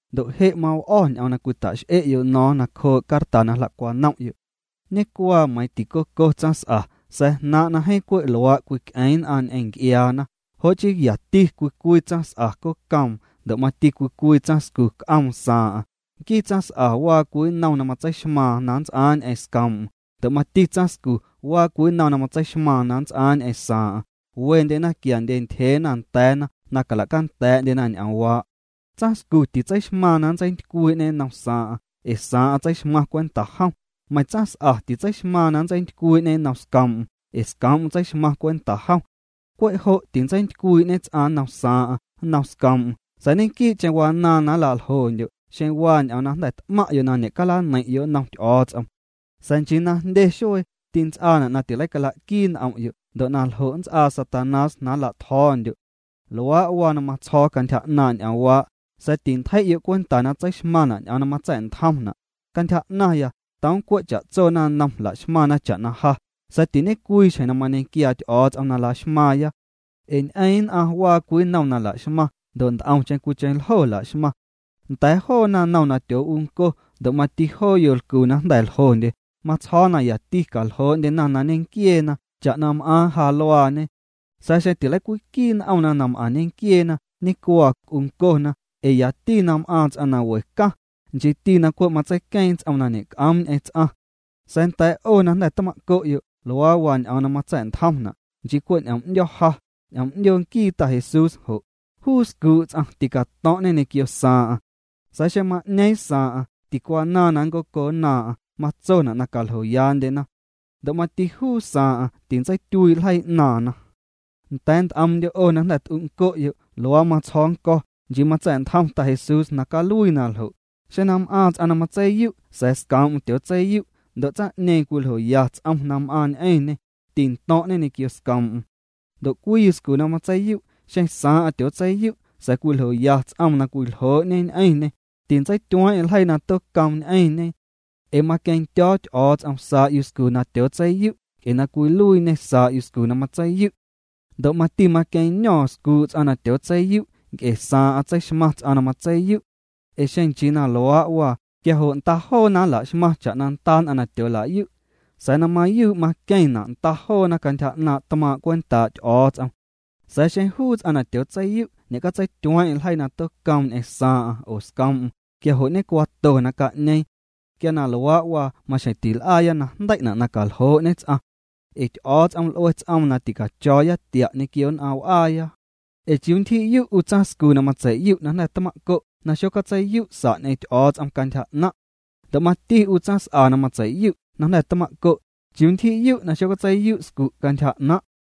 Ndo' je' maw'o̱ ñ'oom na cwita'x'e'yo' no̱o̱ⁿ nacjoo' carta na jla'cwanom'yo'. Ñecuaa meiiⁿ ticoco tsaⁿs'a, sa̱a̱ jnaaⁿ' na jeeⁿ cwe' luaa' cwic'eeⁿ nn'aⁿ ñ'eⁿ nc'iaana, jo' chii yati cwii cwii tsaⁿs'a cocoom ndo' mati cwii cwii tsaⁿscu c'oom saaⁿ'aⁿ. Nquii tsaⁿs'a waa cwii nnom na matseixmaaⁿ na nnts'aaⁿ ñ'eⁿ scoom'm ndo' mati tsaⁿscu waa cwii nnom na matseixmaaⁿ na nnts'aaⁿ ñ'eⁿ saaⁿ'aⁿ. Wendyena quiandye ntyjeena nda̱a̱na na cala'canda̱a̱'ndyena ñ'oomwaa'. Tsaⁿscu titseixmaaⁿ na nntseintycwii'ñê nnom saaⁿ'aⁿ ee saaⁿ'aⁿ tseixmaⁿ cwenta jom, meiⁿ tsaⁿs'a titseixmaaⁿ na nntseintycwii'ñê nnom scoom'm ee scoom'm tseixmaⁿ cwenta jom. Cwe' jo' tintseintycwii'ñe ts'aⁿ nnom saaⁿ'aⁿ, nnom scoom'm sa̱a̱ ñequii'cheⁿ wanaaⁿ na nla'ljondyo' xeⁿ waa ñ'oom na jnda̱ t'maⁿ'yo' na ñe'calaneiⁿ'yo' nnom Ty'o̱o̱ts'om. Sa̱a̱ nchii na jndye xuee, tints'aana' na tileicala'quii n'om'yo' ndo' na ljo' nnts'aa Satanás na nla'tjo̱o̱ndyo'. Luaa' waa na matsjo̱o̱ cantyja 'naaⁿ' ñ'oomwaa', sa̱a̱ tintjei'yo' cwenta na tseixmaⁿna' ñ'oom na matsa̱'ntjomna'. Cantyja 'naⁿya toom cwe' cha'tso naⁿnom laxmaⁿna cha'na ja, sa̱a̱ tiñe'cwii xjeⁿ na mañequiaa Ty'o̱o̱ts'om na laxmaaⁿya. Ee ñ'eeⁿ nn'aⁿ waa cwii nnom na la'xmaⁿ, ndo' nt'omcheⁿ cwiicheⁿ ljo la'xmaⁿ. Nda̱a̱ joo naⁿnom na tyoo'unco ndo' mati joo yolcu na jnda̱ ljondye, matsjo̱o̱ na yati caljoo'ndyena na ñenquieena cha'na m'aaⁿ ja luaañe. Sa̱a̱ xeⁿ tileicwiquii n'omna na m'aⁿ ñenquieena, ñecuaa, c'uncona, ee yati na m'aaⁿ ts'aⁿ na we caⁿ, nchiiti na cwe' matseiqueeⁿ ts'oom na ñe'c'oom ñ'eⁿ ts'aⁿ. Sa̱a̱ nda̱a̱ 'o na jnda̱ tma'co'yo', luaa waa ñ'oom na matsa̱'ntjomna', nchii cwe' ñ'oom 'ndyo̱ ja, ñ'oom 'ndyoo nquii Ta Jesús jo': juu scuu' ts'aⁿ ticato̱ⁿ'ñê ñequio saaⁿ'aⁿ. Sa̱a̱ xeⁿ ma'ñeeⁿ saaⁿ'aⁿ, ticwanaaⁿ na ncoconnaaⁿ'aⁿ, matsona' na caljoyaandyennda'na. Ndo' mati juu saaⁿ'aⁿ, tintseityuii' ljeii 'naaⁿna. Nda̱a̱ nt'omndyo' 'o na jnda̱ t'unco'yo', luaa matsjo̱o̱ nnco̱, nchii matsa̱'ntjom Ta Jesús na caluii na ljo', xeⁿ na m'aaⁿ ts'aⁿ na matseiyu' sa̱a̱ scoom'm tyootseiyu' ndo' tsaⁿ'ñeeⁿ cwiljoya ts'om na m'aaⁿ ñ'eⁿñê, tinto̱ⁿ'ñê ñequio scoom'm. Ndo' cwii yuscu na matseiyu', xeⁿ saaⁿ'aⁿ tyootseiyu', sa̱a̱ cwiljoya ts'om na cwiljoo'ñe ñ'eⁿñê, tintseityueeⁿeⁿ ljeii na tocoom ñ'eⁿñe. Ee maqueⁿndyo̱o̱ Ty'o̱o̱ts'om saa' yuscu na tyootseiyu' nc'e na cwiluiiñê saa' yuscu na matseiyu'. Ndo' mati maqueⁿño̱o̱ⁿ scuu' ts'aⁿ na tyootseiyu' nc'e saaⁿ'aⁿ tseixmaⁿ ts'aⁿ na matseiyu'. Ee xeⁿ nchii na luaa' waa, quia jo' nda joona nla'xmaⁿ cha'na nda nn'aⁿ na tyoola'yu', sa̱a̱ na mayuu' maqueⁿna' nda joona cantyja 'naaⁿ' tmaaⁿ' cwentaa' Ty'o̱o̱ts'om. Sa̱a̱ xeⁿ juu ts'aⁿ na tyootseiyu' ñe'catseityueeⁿ'eⁿ ljeii na tocoom ñ'eⁿ saaⁿ'aⁿ oo scoom'm, quia jo' ñecuaato na ca'ñeeⁿ. Quia na luaa' waa maxjeⁿ til'aaya na jndei'na' na caljoo'ñe ts'aⁿ. Ee Ty'o̱o̱ts'om l'ue ts'oom na ticacho̱o̱ya tia' ñequio nn'aⁿ w'aaya. Ee ¿chiuu ntyji'yu' 'u tsaⁿscu na matsei'yu' na jnda̱ tma'co' na xocatsei'yu' sa' ñ'eⁿ Ty'o̱o̱ts'om cantyja 'naⁿ'? Ndo' mati 'u tsaⁿs'a na matsei'yu' na jnda̱ tma'co', ¿chiuu ntyji'yu' na xocatseiyu' scu' cantyja 'naⁿ'?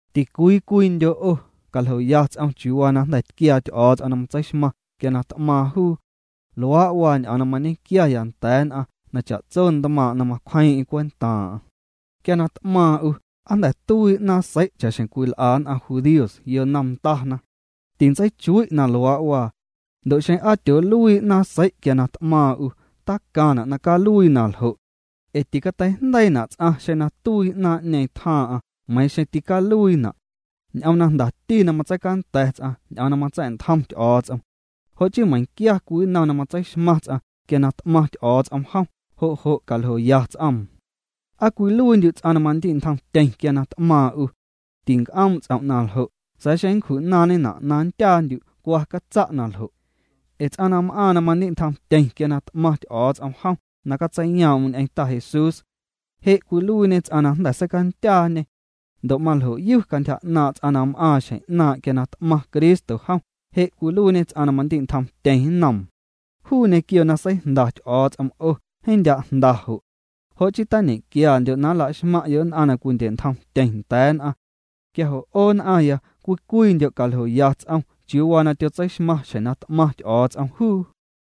Ticwii cwiindyo' 'o, caljoya ts'om chiuu waa na jnda̱ tquiaa Ty'o̱o̱ts'om na matseixmaⁿ quia na t'maaⁿ juu. Luaa' waa ñ'oom na mañequiaaya nda̱a̱ nn'aⁿ cha'tso ntmaaⁿ' nn'aⁿ na macwjeeⁿ'eⁿ cwentaaⁿ'aⁿ. Quia na t'maaⁿ 'u, ¿aa jnda̱ tuii 'naaⁿ sei' cha'xjeⁿ cwil'a nn'aⁿ judíos yonom ndana? Tintseichui' na luaa' waa. Ndo' xeⁿ aa tyooluii 'naaⁿ sei' quia na t'maaⁿ 'u, tacaⁿna' na caluii na ljo'. Ee ticateijndeiina' ts'aⁿ xeⁿ na tuii 'naaⁿ'ñeeⁿ tjaaⁿ'aⁿ meiiⁿ xeⁿ ticaluiina'. Ñ'oom na jndati na catseicanda̱ ts'aⁿ ñ'oom na matsa̱'ntjom Ty'o̱o̱ts'om. Jo' chii meiⁿquia cwii nnom na matseixmaⁿ ts'aⁿ quia na t'maⁿ Ty'o̱o̱ts'om jom, jo' jo' caljoya ts'oom. ¿Aa cwiluiindyu' ts'aⁿ na mandi'ntjomtyeⁿ quia na t'maaⁿ 'u? Tinc'oom' ts'om' na ljo', sa̱a̱ xeⁿ nncju'naaⁿñena' na nndyaandyu', cwa catsa' na ljo'. Ee ts'aⁿ na m'aaⁿ na mandi'ntjomtyeⁿ quia na t'maⁿ Ty'o̱o̱ts'om jom na catseiyoom'm ñ'eⁿ Ta Jesús, je' cwiluiiñe ts'aⁿ na jnda̱ seicandyaa'ñê. Ndo' maljoyu cantyja 'naaⁿ' ts'aⁿ na m'aaⁿ xjeⁿ 'naaⁿ' quia na t'maⁿ Cristo jom, je' cwiluiiñê ts'aⁿ na mandi'ntjomtyeⁿ nnoom. Juu ñequio na seijnda Ty'o̱o̱ts'om 'o, jeeⁿ ndya' jnda jo'. Jo' chii tiñequiandyo' na laxmaⁿ'yo' nn'aⁿ na cwindye'ntjomtyeⁿ nda̱a̱ nn'aⁿ. Quia jo' 'o nn'aⁿya, cwii cwiindyo' caljoya ts'om chiuu waa na tyotseixmaⁿ xjeⁿ na t'maⁿ Ty'o̱o̱ts'om juu.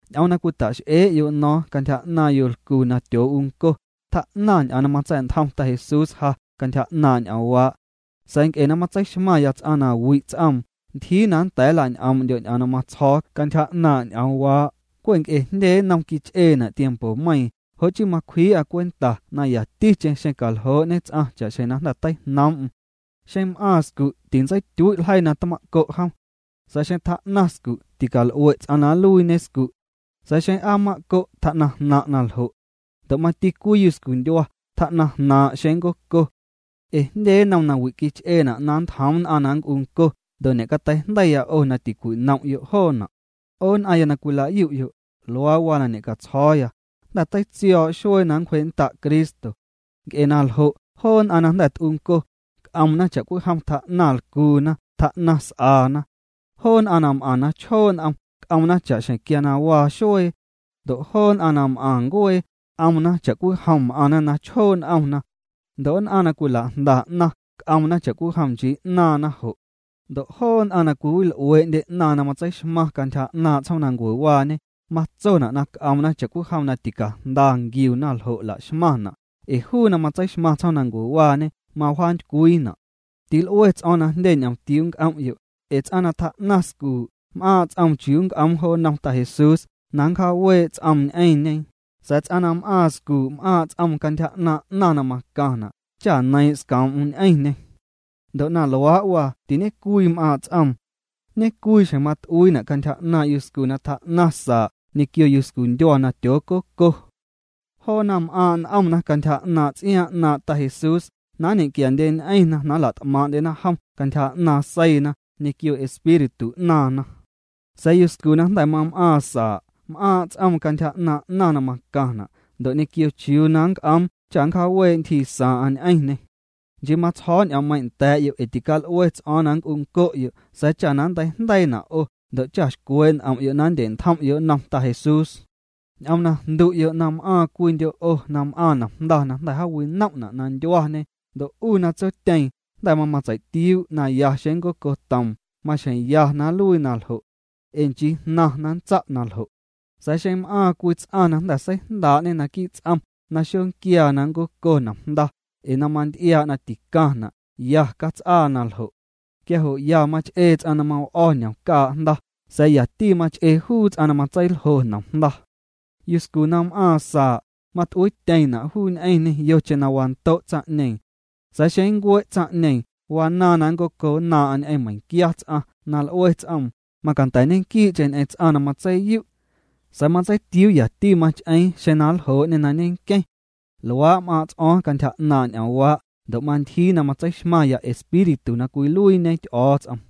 Ñ'oom na cwita'x'ee'yo' no̱o̱ⁿ cantyja 'naaⁿ yolcu na tyoo'unco, tjaa'naⁿ ñ'oom na matsa̱'ntjom Ta Jesús ja cantyja 'naaⁿ' ñ'oomwaa'. Sa̱a̱ nc'e na matseixmaⁿya ts'aⁿ na wi' ts'oom, ntyjii na nda̱a̱ nla'ñ'oom'ndyo' ñ'oom na matsjo̱o̱ cantyja 'naaⁿ' ñ'oomwaa'. Cwe' nc'e jndye nnom quich'eena' tiempomeiiⁿ, jo' chii macwjii'a cwenta na yaticheⁿ caljoo'ñe ts'aⁿ cha'xjeⁿ na jnda̱ teijnoom'm. Xeⁿ m'aaⁿ scu', tintseityuii' ljeii na tma'co' jom. Sa̱a̱ xeⁿ tjaa'naⁿ scu', tical'ue' ts'aⁿ na nluiiñe scu'. Sa̱a̱ xeⁿ aa mma'co', tjaa'naⁿ jnaⁿ' naljo'. Ndo' mati cwii yuscundyua, tjaa jnaaⁿ' xeⁿ ncoco. Ee jndye nnom nawi' quich'eena' na nntjoom nn'aⁿ na nnc'unco ndo' ñe'cateijndeiya 'o na tincwinom'yo' joona'. 'O nn'aⁿya na cwila'yu'yo', luaa waa na ñe'catsjo̱o̱ya: Jnda̱ teitsio̱o̱' xuee na nncwjee'nnda' Cristo. Nc'e na ljo' joo nn'aⁿ na jnda̱ t'unco, c'omna cha'cwijom tjaa'naⁿ lcuuna, tjaa'naⁿ s'aana. Joo nn'aⁿ na m'aⁿ na chjoo' n'om, c'omna cha'xjeⁿ quia waa xuee. Ndo' joo nn'aⁿ na m'aⁿ ncuee, c'omna cha'cwijom m'aⁿna na chjoo' n'omna. Ndo' nn'aⁿ na cwilajnda 'naⁿ c'omna cha'cwijom nchii 'naaⁿna jo'. Ndo' joo nn'aⁿ na cwiwil'uee'ndye 'naⁿ na cwila'xmaⁿ cantyja 'naaⁿ' tsjoomnancuewaañe, matsona' na c'omna cha'cwijom na ticajnda nquiuna ljo' la'xmaⁿna', ee juu na matseixmaⁿ tsjoomnancuewaañe mawjaantycwiina'. Til'ue ts'o̱o̱ⁿ na jndye ñomtiuu nc'om'yo', ee ts'aⁿ na tjaa'naⁿ scuu', m'aaⁿ' ts'oom chiuu nnc'oom jo nnom Ta Jesús, na nncjaawee' ts'oom ñ'eⁿñe, sa̱a̱ ts'aⁿ na m'aaⁿ scuu', m'aaⁿ' ts'oom cantyja 'naaⁿ 'naⁿ na macaⁿna' cha neiiⁿ' scoom'm ñ'eⁿñê. Ndo' na luaa' waa, tiñecwii m'aaⁿ' ts'oom. Ñecwii xjeⁿ mat'uiina' cantyja 'naaⁿ' yuscu na tjaa'naⁿ saa' ñequio yuscu ndyua na tyoococo. Joona m'aaⁿ' n'omna cantyja 'naaⁿ' ts'iaaⁿ 'naaⁿ' Ta Jesús, na nñequiandyeñ'eⁿna na la't'maaⁿ'ndyena jom cantyja 'naaⁿ seiina ñequio espíritu 'naaⁿna. Sa̱a̱ yuscu na jnda̱ mam'aaⁿ saa', m'aaⁿ' ts'oom cantyja 'naaⁿ' 'naⁿ na macaⁿna' ndo' ñequio chiuu na nnc'oom cha nncjaawee' ntyjii saaⁿ'aⁿ ñ'eⁿñê. Nchii matsjo̱o̱ ñ'oommeiⁿ' nda̱a̱'yo' ee tical'ue ts'o̱o̱ⁿ na nnc'unco'yo' sa̱a̱ cha na nnteijndeiina' 'o ndo' cha na xcwee' n'om'yo' na nndye'ntjom'yo' nnom Ta Jesús. Ñ'oom na jndu'yo' na m'aaⁿ cwiindyo' 'o na m'aaⁿ nomjnda na jnda̱ jaawinom'na' na ndyuañe ndo' 'u na tsotyeeⁿ jnda̱ mamatseitiuu' na ya xeⁿ nncocotoom, maxjeⁿ ya na nluii na ljo'. Ee nchii jnaⁿ' na nntsa' na ljo'. Sa̱a̱ xeⁿ m'aaⁿ cwii ts'aⁿ na jnda̱ seijndaa'ñe naquii' ts'om na xonquiaa na nncoco nomjnda, ee na manty'iaa' na ticaⁿna', ya cats'aa na ljo'. Quia jo' ya mach'ee ts'aⁿ na maw'o̱ ñomcaa' jnda, sa̱a̱ yati mach'ee juu ts'aⁿ na matseiljo nomjnda. Yuscu na m'aaⁿ saa', mat'uiityeⁿna' juu ñ'eⁿñê yocheⁿ na wando' tsaⁿ'ñeeⁿ. Sa̱a̱ xeⁿ nncue' tsaⁿ'ñeeⁿ, wanaaⁿ na ncoconnaaⁿ'aⁿ ñ'eⁿ meiⁿquia ts'aⁿ na l'ue ts'oom, macanda̱ ñequii'cheⁿ ñ'eⁿ ts'aⁿ na matseiyu'. Sa̱a̱ matseitiuu yati mach'eeⁿ xeⁿ na nljoo'ñê na ñenqueⁿ. Luaa' m'aaⁿ' ts'o̱o̱ⁿ cantyja 'naaⁿ' ñ'oomwaa' ndo' mantyjii na matseixmaⁿya Espíritu na cwiluiiñe Ty'o̱o̱ts'om.